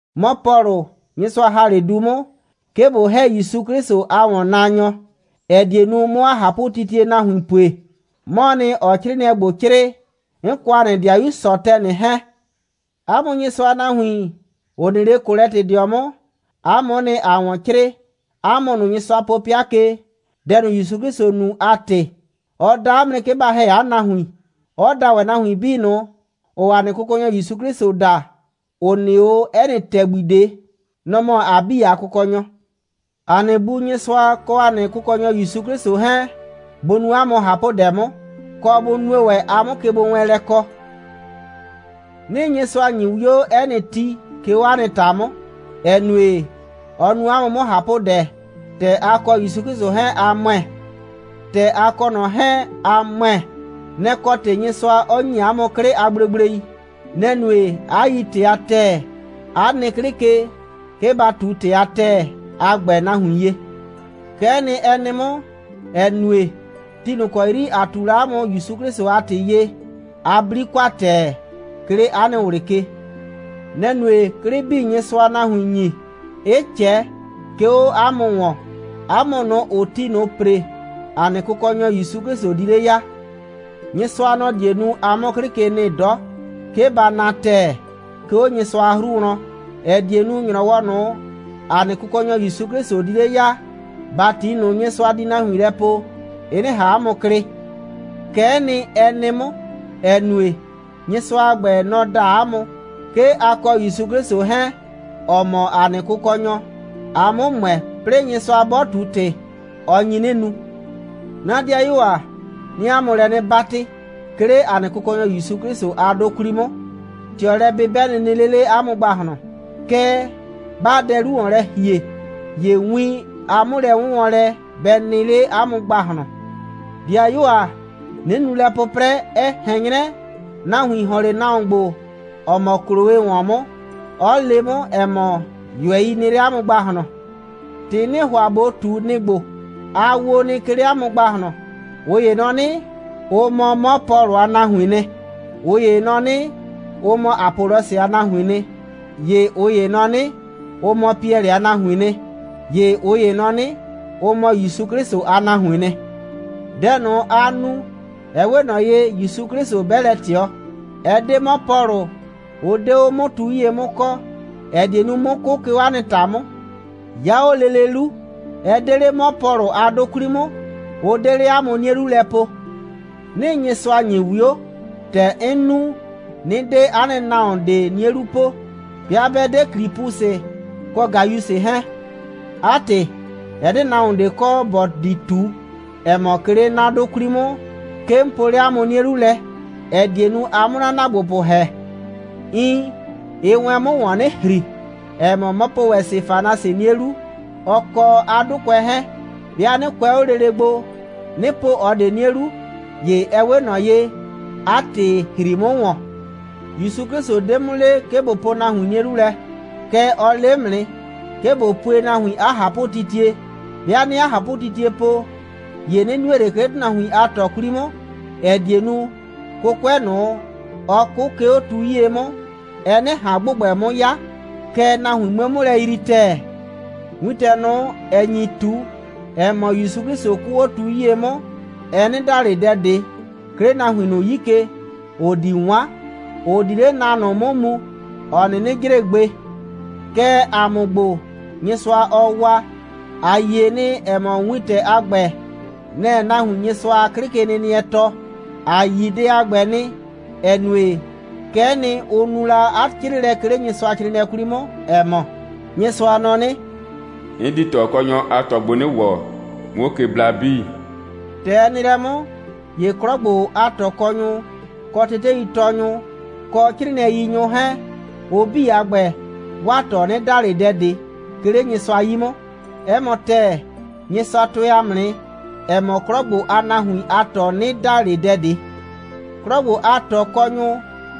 'Mɔ Pɔlʋ, Nyɩsʋa ‑ha 'le du 'mʋ, 'ke ꞊bo ‑hɛ ‑Yusu 'Klɩsʋ a ‑wɔnnaanyɔ, ‑ɛ die nu, 'mʋ 'a ꞊hapʋtitie nahuin pue, 'mɔɔ nɩ, ‑ɔɔ 'crɩɩnɩɛ ‑gbo 'crɩɩ, 'n kɔ ‑a nɩ ‑dɩayu Sɔtɛnɩ 'hɛɛn. 'A mʋ Nyɩsʋa a nahuin, ‑ʋ nɩ 'le Kolɛtɩdɩɔ 'mʋ, 'a mʋ'ʋ nɩ, ‑aa ‑wɔn 'crɩɩ, 'a mʋ ꞊nʋ, Nyɩsʋa po 'pɩa ke, dɛ ꞊nʋ, ‑Yusu 'Klɩsʋ nu a ‑tɩ. Ɔ da 'a mʋ nɩ, 'ke ba ‑hɛ 'a nahuin, 'ɔ da ‑wɛ nahuin 'bii ꞊nʋ, ‑ʋʋ ‑a nɩ Kʋkɔnyɔ ‑Yusu 'Klɩsʋ da, ‑ʋ nɩ 'o 'ɛ nɩ ‑tɛgbi ꞊de. Nɔ‑ mɔ ‑a 'bii a Kʋkɔnyɔ. ‑A nɩ Bu Nyɩsʋa kɔ ‑a nɩ Kʋkɔnyɔ ‑Yusu 'Klɩsʋ 'hɛɛn, bʋ nu 'a mʋ ꞊hapʋdɛ 'mʋ, kɔ bʋ nue ‑wɛ, a 'mʋ kegbowɛɛnlɛ kɔ. 'Nɩɩ Nyɩsʋa ‑nyi 'wio 'ɛ nɩ ti, 'ke 'o 'a nɩ ‑ta 'mʋ, ‑ɛ nue, ɔ nu 'a mʋ 'mʋ ꞊hapʋdɛ, ‑tɛ a kɔ ‑Yusu 'Klɩsʋ 'hɛɛn, a ‑mʋɛ. ‑Tɛ a kɔ ꞊nɔ 'hɛɛn, a ‑mʋɛ, nɛ‑ kɔ ‑tɩ Nyɩsʋa 'ɔ ‑nyi 'a mʋ 'klɩ a gblegblei. Nɛ‑ nue, 'a yi ‑tɩ a ‑tɛɛ, 'a nɩ 'klɩ ke, 'ke ba ꞊tu ‑tɩ a ‑tɛɛ a ‑gbɛ nahuin ye. Kɛ'ɛ nɩ, ɛ nɩ 'mʋ, ‑ɛ nue, ti ꞊nʋ ‑kɔ 'yri ‑a ꞊tu la 'a mʋ ‑Yusu 'Klɩsʋ a ‑tɩ ye, a 'bli kwa ‑tɛɛ, 'ke 'le 'a nɩ ꞊wlɩ ke. Nɛ‑ nue, 'klɩ 'bii, Nyɩsʋaa nahuin ‑nyi, 'ɩ ꞊cɛ, 'ke 'o 'a mʋ ‑wɔn, 'a mʋ ꞊nʋ, ‑ʋʋ ti ꞊nʋ ‑pre, ‑a nɩ Kʋkɔnyɔ ‑Yusu 'Klɩsʋ di 'le ya. Nyɩsʋa, nɔ‑ die nu, a 'mʋ 'klɩ ke nɩ 'dɔ, 'ke ba na ‑tɛɛ, 'ke 'o Nyɩsʋa a 'hru wlɔn, ‑ɛ die nu, ‑nyrɔwɔ ꞊nʋ, ‑a nɩ Kʋkɔnyɔ ‑Yusu 'Klɩsʋ di 'le ya, ‑bati ꞊nʋ, Nyɩsʋa di nahuin lɛ poo, ɩ 'nɩ ꞊han 'a mʋ klɩ. Kɛ'ɛ nɩ, ɛ nɩ 'mʋ, ‑ɛ nue, Nyɩsʋa a ‑gbɛ, nɔ‑ da 'a mʋ, 'ke a kɔ ‑Yusu 'Klɩsʋ 'hɛɛn, ‑ɔ mɔ ‑a nɩ Kʋkɔnyɔ, a 'mʋ ‑mʋɛ, 'plɩɩ Nyɩsʋa 'bɔ ꞊tu ‑tɩ, ɔ nyi 'nɩ nu. 'Na 'dɩayuo ‑a, 'nɩɩ 'a mʋ lɛ 'nɩ 'batɩ, 'ke 'le ‑a nɩ Kʋkɔnyɔ ‑Yusu 'Klɩsʋ a 'dʋ 'kwli 'mʋ, ꞊tɩɔlɛ'bɩbɛ nɩ nɩ 'le 'le 'a mʋ ‑gbahlɔn, kɛɛ, 'baa dɛ 'lu ‑wɔn lɛ ‑hie, ‑ye win a 'mʋlɛ'wʋnwɔnlɛ bɛ nɩ 'le 'a mʋ ‑gbahlɔn. 'Dɩayuo ‑a, 'nɩ nu lɛ 'pʋprɛ, ɛ ꞊hɛn 'nyrɛ, nahuin ‑hɔn 'le nahuon ‑gbo, ‑ɔ mɔ Kloe ‑wɔn 'mʋ, 'ʋ le 'mʋ, ‑ɛ mɔ, ꞊yʋɛi nɩ 'le 'a mʋ ‑gbahlɔn. ‑Tɩ 'nɩɩ ‑hʋa ꞊bo ꞊tu, nɩ‑ ‑gbo: A wo nɩ, 'ke 'le 'a mʋ ‑gbahlɔn. ꞊Ʋ ‑ye nɔ 'nɩ, ʋ mɔ 'mɔ Pɔlʋ a nahuiin nɩ, ꞊ʋ ‑ye nɔ 'nɩ, ʋ mɔ Apɔlɔsɩ a nahuiin nɩ, ‑ye ꞊ʋ ‑ye nɔ 'nɩ, ʋ mɔ Piɛlɩ a nahuiin nɩ, ‑ye ꞊ʋ ‑ye nɔ 'nɩ, ʋ mɔ ‑Yusu 'Klɩsʋ a nahuiin nɩ. Dɛ ꞊nʋ, aa nu, ɛ 'we ꞊nɔ ye, ‑Yusu 'Klɩsʋ 'bɛ lɛ ꞊tɩɔ. Ɛ 'de 'mɔ Pɔlʋ, ʋ 'de 'o 'mʋ tu 'yie 'mʋ kɔɔ, ‑ɛ die nu, 'mʋ 'kʋ, 'ke 'o 'a nɩ ‑ta 'mʋ. 'Ya 'o lele 'lu, ɛ 'de 'le 'mɔ Pɔlʋ a 'dʋ 'kwli 'mʋ, ʋ 'de 'le 'a mʋ 'nie 'lu lɛ poo. 'Nɩɩ Nyɩsʋa ‑nyi 'wio, ‑tɛ 'n nu, 'nɩ 'de 'a nɩ nahuon ꞊de 'nie 'lu po, 'bɩa 'bɛ 'de Klipusɩ kɔ Gayusɩ 'hɛɛn. 'A ‑tɩ, ɛ 'de nahuon ꞊de kɔ, ‑bɔ di ꞊tu, ‑ɛ mɔ, 'ke 'le 'na 'dʋ 'kwli 'mʋ, 'ke 'n poo 'le 'a mʋ 'nie 'lu lɛ, ‑ɛ die nu, a 'mʋ 'na ‑naagbopʋ ‑hɛ. Iin, ɩɩ wɛn 'mʋ ‑wɔn mu 'nɩ ‑hri, ‑ɛ mɔ, 'mɔ po ‑wɛ Sefanasɩ 'nie 'lu, ɔ kɔ 'a 'dʋkʋɛ 'hɛɛn. 'Bɩa 'nɩ kʋɛ 'o lele gbo, 'nɩ po ꞊ɔ ꞊de 'nie 'lu, ‑ye ɛ 'we ꞊nɔ ye, 'a ‑tɩ ‑hri 'mʋ ‑wɔn. ‑Yusu 'Klɩsʋ 'de 'mʋ le, 'ke ꞊bo po nahuin 'nie 'lu lɛ, kɛɛ, ɔ le 'mʋ nɩ, 'ke ꞊bo pue nahuin 'a ꞊hapʋtitie. 'Bɩa 'nɩɩ 'a ꞊hapʋtitie po, ‑ye 'nɩ nue ꞊le, 'ke 'le ‑tʋnahuin a ꞊tɔ 'kwli 'mʋ, ‑ɛ die nu, 'kʋkʋɛ ꞊nʋ, ɔ 'kʋ, 'ke 'o tu 'yie 'mʋ, ɛ 'nɩ ꞊han ‑gbʋgbɛ 'mʋ 'ya, kɛɛ, nahuin 'mue 'mʋ lɛ yrii ‑tɛɛ. Wintɛ ꞊nʋ, ‑ɛ nyi ꞊tu, ‑ɛ mɔ, ‑Yusu 'Klɩsʋ 'kʋʋ 'o tu 'yie 'mʋ, ɛ 'nɩ da ꞊le dɛ ꞊de, 'ke 'le nahuin ꞊nʋ 'yi ke, ‑ʋ di 'wan, ‑ʋ di 'le na ꞊nʋ 'mʋ mu, ‑ɔ 'nɩnɩ jre gbe. Kɛɛ, ‑a mʋ ‑gbo, Nyɩsʋa, ɔɔ waa, ‑a yie nɩ, ‑ɛ mɔ, wintɛ a ‑gbɛ, nɛ‑ɛ nahuin Nyɩsʋa a 'klɩkenɩnɩɛ tɔɔ. ‑A yi dɛ a ‑gbɛ nɩ, ‑ɛ nue, kɛ'ɛ nɩ, ʋ nu la 'a 'crɩɩlɛ, 'ke 'le Nyɩsʋacrɩɩnɩɛ 'kwli 'mʋ, ‑ɛ mɔ: «Nyɩsʋa nɔ 'nɩ: 'N di ꞊tɔkɔnyʋ a ꞊tɔ gbo 'nɩ ‑wɔ, 'muo ke bla 'bii.» ‑Tɛ ɛ nɩ lɛ 'mʋ, ‑ye 'klɔ ‑gbo a ꞊tɔkɔnyʋ, kɔ teteitɔɔnyʋ, kɔ 'crɩɩnɩɛyinyʋ 'hɛɛn, ʋ 'bii a ‑gbɛ, 'waa ꞊tɔ 'nɩ da ꞊le dɛ ꞊de, 'ke 'le Nyɩsʋa 'yi 'mʋ. 'Ɛ mɔ ‑tɛɛ, Nyɩsʋa tʋɛ ‑a mʋ nɩ, ‑ɛ mɔ, 'klɔ ‑gbo a nahuin a ꞊tɔ 'nɩ da ꞊le dɛ ꞊de. 'Klɔ ‑gbo a ꞊tɔkɔnyʋ,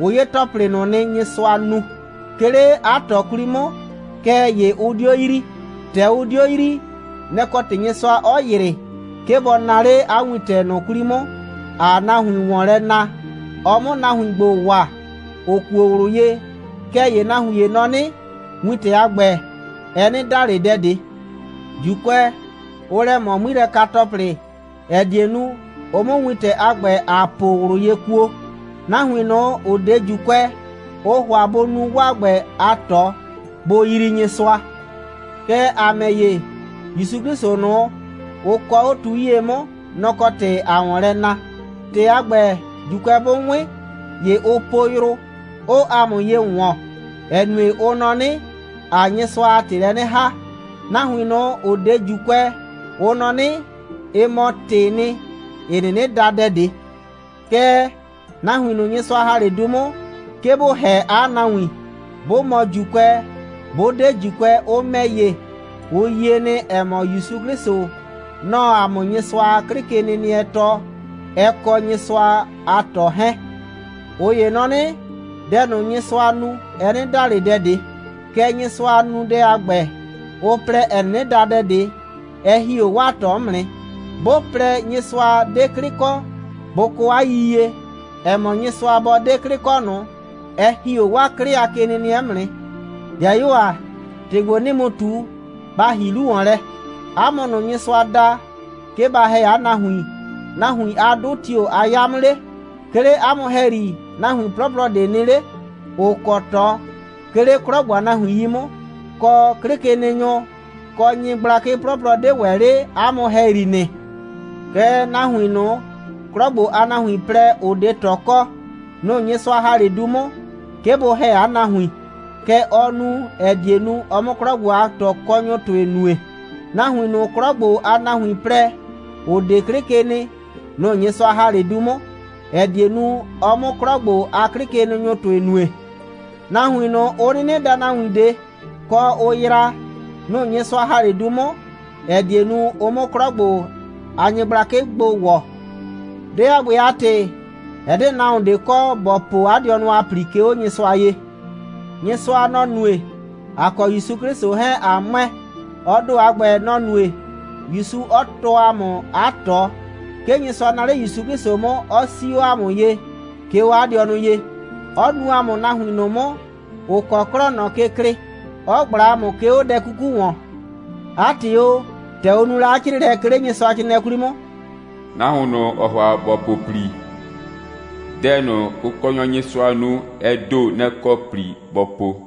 ʋ 'ye ‑tɔplɩ ꞊nʋ nɩ, Nyɩsʋa nu, 'ke 'le 'a ꞊tɔ 'kwli 'mʋ, kɛɛ ‑ye ʋ 'dio yrii. ‑Tɛ ʋ 'dio yrii, nɛ‑ kɔ ‑tɩ Nyɩsʋa 'ɔ ‑yrɩ, 'ke bɔ naa 'le 'a wintɛ ꞊nʋ 'kwli 'mʋ, ‑aa nahuin ‑wɔn lɛ na, ɔ 'mʋ nahuin ‑gbo waa, ‑ʋ kuo ꞊wlʋ ye. Kɛɛ ‑ye nahuin ‑ye nɔ 'nɩ, wintɛ a ‑gbɛ, ɛ 'nɩ da ꞊le dɛ ꞊de. ‑Juukʋɛ, ʋʋ lɛ ꞊mɔ 'ŋmilɛka‑tɔplɩ, ‑ɛ die nu, ʋ 'mʋ wintɛ a ‑gbɛ, ‑aa po ꞊wlʋ ye kuo. Nahuin ꞊nʋ, ‑ʋ 'de ‑Juukʋɛ, ʋʋ ‑hʋa bʋ nu 'waa ‑gbɛ a ꞊tɔ, bʋ yrii Nyɩsʋa. Kɛɛ, ‑a ‑mɛ ‑ye, ‑Yusu 'Klɩsʋ ꞊nʋ, ʋ kɔɔ 'o tu 'yie 'mʋ, nɔ‑ kɔ ‑tɩ ‑aa ‑wɔn lɛ na. ‑Tɩ a ‑gbɛ, ‑Juukʋɛ 'bʋ 'wɩn, ‑ye ʋʋ po yrʋ, 'ʋʋ ‑a mʋ ye ‑wɔn, ‑ɛ nue, ʋ nɔ 'nɩ, ‑aa Nyɩsʋa a ‑tɩ lɛ 'nɩ ‑haa. Nahuin ꞊nʋ, ‑ʋ 'de ‑Juukʋɛ, ʋ nɔ 'nɩ, ɩ mɔ ‑tɩɩ nɩ, ‑ɩ 'nɩnɩ da dɛ ꞊de. Kɛɛ, nahuin ꞊nʋ, Nyɩsʋa ‑ha 'le du 'mʋ, 'ke bʋ ‑hɛ 'a nahuin, bʋ mɔ ‑Juukʋɛ, bʋ 'de ‑Juukʋɛ, ʋ ‑mɛ ‑ye, ʋ yie nɩ, ‑ɛ mɔ, ‑Yusu 'Klɩsʋ, nɔ‑ɔ ‑a mʋ Nyɩsʋa a 'klɩkenɩnɩɛ tɔɔ, ɛ kɔ Nyɩsʋa a ꞊tɔ 'hɛɛn. ꞊Ʋ ‑ye nɔ 'nɩ, dɛ ꞊nʋ, Nyɩsʋaa nu, ɛ 'nɩ da ꞊le dɛ ꞊de, kɛɛ, Nyɩsʋa a nunudɛ a ‑gbɛ, ʋ plɛ, ‑ɛ 'nɩnɩ da dɛ ꞊de, ɛ ‑hi 'o 'waa ꞊tɔ 'mʋ nɩ. 'Bʋ plɛ, Nyɩsʋa 'de 'klɩ kɔ, bʋ kɔ 'a yiyie, ‑ɛ mɔ, Nyɩsʋa bɔ 'de 'klɩ kɔ ꞊nʋ, ɛ ‑hi 'o 'waa 'klɩ a kenɩnɩɛ 'mʋ nɩ. ‑Dɩayuo ‑a, ‑tɩ ‑gbo, 'nɩɩ mu ꞊tu, ba ‑hi 'lu ‑wɔn lɛ: 'A mʋ ꞊nʋ, Nyɩsʋa da, 'ke ba ‑hɛ 'a nahuin, nahuin a 'dʋ tio‑ a 'ya 'mʋ 'le? 'Ke 'le 'a mʋ ‑hɛyri, nahuin 'plɔplɔ 'de 'le nɩ, ‑ʋ kɔ ꞊tɔ, 'ke 'le 'klɔ ‑gbo a nahuin 'yi 'mʋ, kɔ, 'klɩkenɩnyʋ, kɔ nyɩblakɩ 'plɔplɔ 'de ‑wɛ 'le 'a mʋ ‑hɛyri nɩ. Kɛɛ, nahuin ꞊nʋ, 'klɔ ‑gbo a nahuin plɛ, ‑ʋ 'de ꞊tɔ kɔ, nʋ‑ Nyɩsʋa ‑ha 'le du 'mʋ, 'ke bʋ ‑hɛ 'a nahuin. Kɛ ɔ nu, ‑ɛ die nu, ɔ 'mʋ 'klɔ ‑gbo a ꞊tɔkɔnyʋ ‑tʋɩ nue. Nahuin ꞊nʋ, 'klɔ ‑gbo a nahuin plɛ, ‑ʋ 'de 'klɩ ke nɩ, nʋ‑ Nyɩsʋa ‑ha 'le du 'mʋ, ‑ɛ die nu, ɔ 'mʋ 'klɔ ‑gbo a 'klɩkenɩnyʋ ‑tʋɩ nue. Nahuin ꞊nʋ, ʋ 'nɩnɩ daa nahuin ꞊de, kɔ, ʋ yraa, nʋ‑ Nyɩsʋa ‑ha 'le du 'mʋ, ‑ɛ die nu, ɔ 'mʋ 'klɔ ‑gbo a nyɩgblakɩ gbo ‑wɔ. Dɛ a ‑gbɛ a ‑tɩ, ɛ 'de nahuon ꞊de kɔ, ‑bɔ po 'a dɩɔnʋ a ‑pli, 'ke 'o Nyɩsʋa ye. Nyɩsʋa, nɔ‑ nue, ‑a kɔ ‑Yusu 'Klɩsʋ 'hɛɛn, ꞊a ‑mʋɛ. Ɔ ‑do a ‑gbɛ, nɔ‑ nue, ‑Yusu 'ɔ tɔɔ ‑a mʋ 'a ꞊tɔ. 'Ke Nyɩsʋa naa 'le ‑Yusu 'Klɩsʋ 'mʋ, 'ɔ 'sii 'o ‑a mʋ ye, 'ke 'o 'a dɩɔnʋ ye, 'ɔ nuu ‑a mʋ nahuin ꞊nʋ 'mʋ, ‑ʋ kɔ 'klɔɔ ꞊nɔ ke klɩɩ, 'ɔ ꞊gbla ‑a mʋ, 'ke 'o dɛ 'kuku ‑wɔn. 'A ‑tɩ o, ‑tɛ ʋ nu la 'a 'crɩɩlɛ, 'ke 'le Nyɩsʋacrɩɩnɩɛ 'kwli 'mʋ: «Nahuon ꞊nʋ, ‑ɔɔ ‑hʋa ‑bɔ po ‑pli, dɛ ꞊nʋ, Kʋkɔnyɔ Nyɩsʋa nu, ɛ ‑do, nɛ‑ kɔ ‑pli bɔ po.»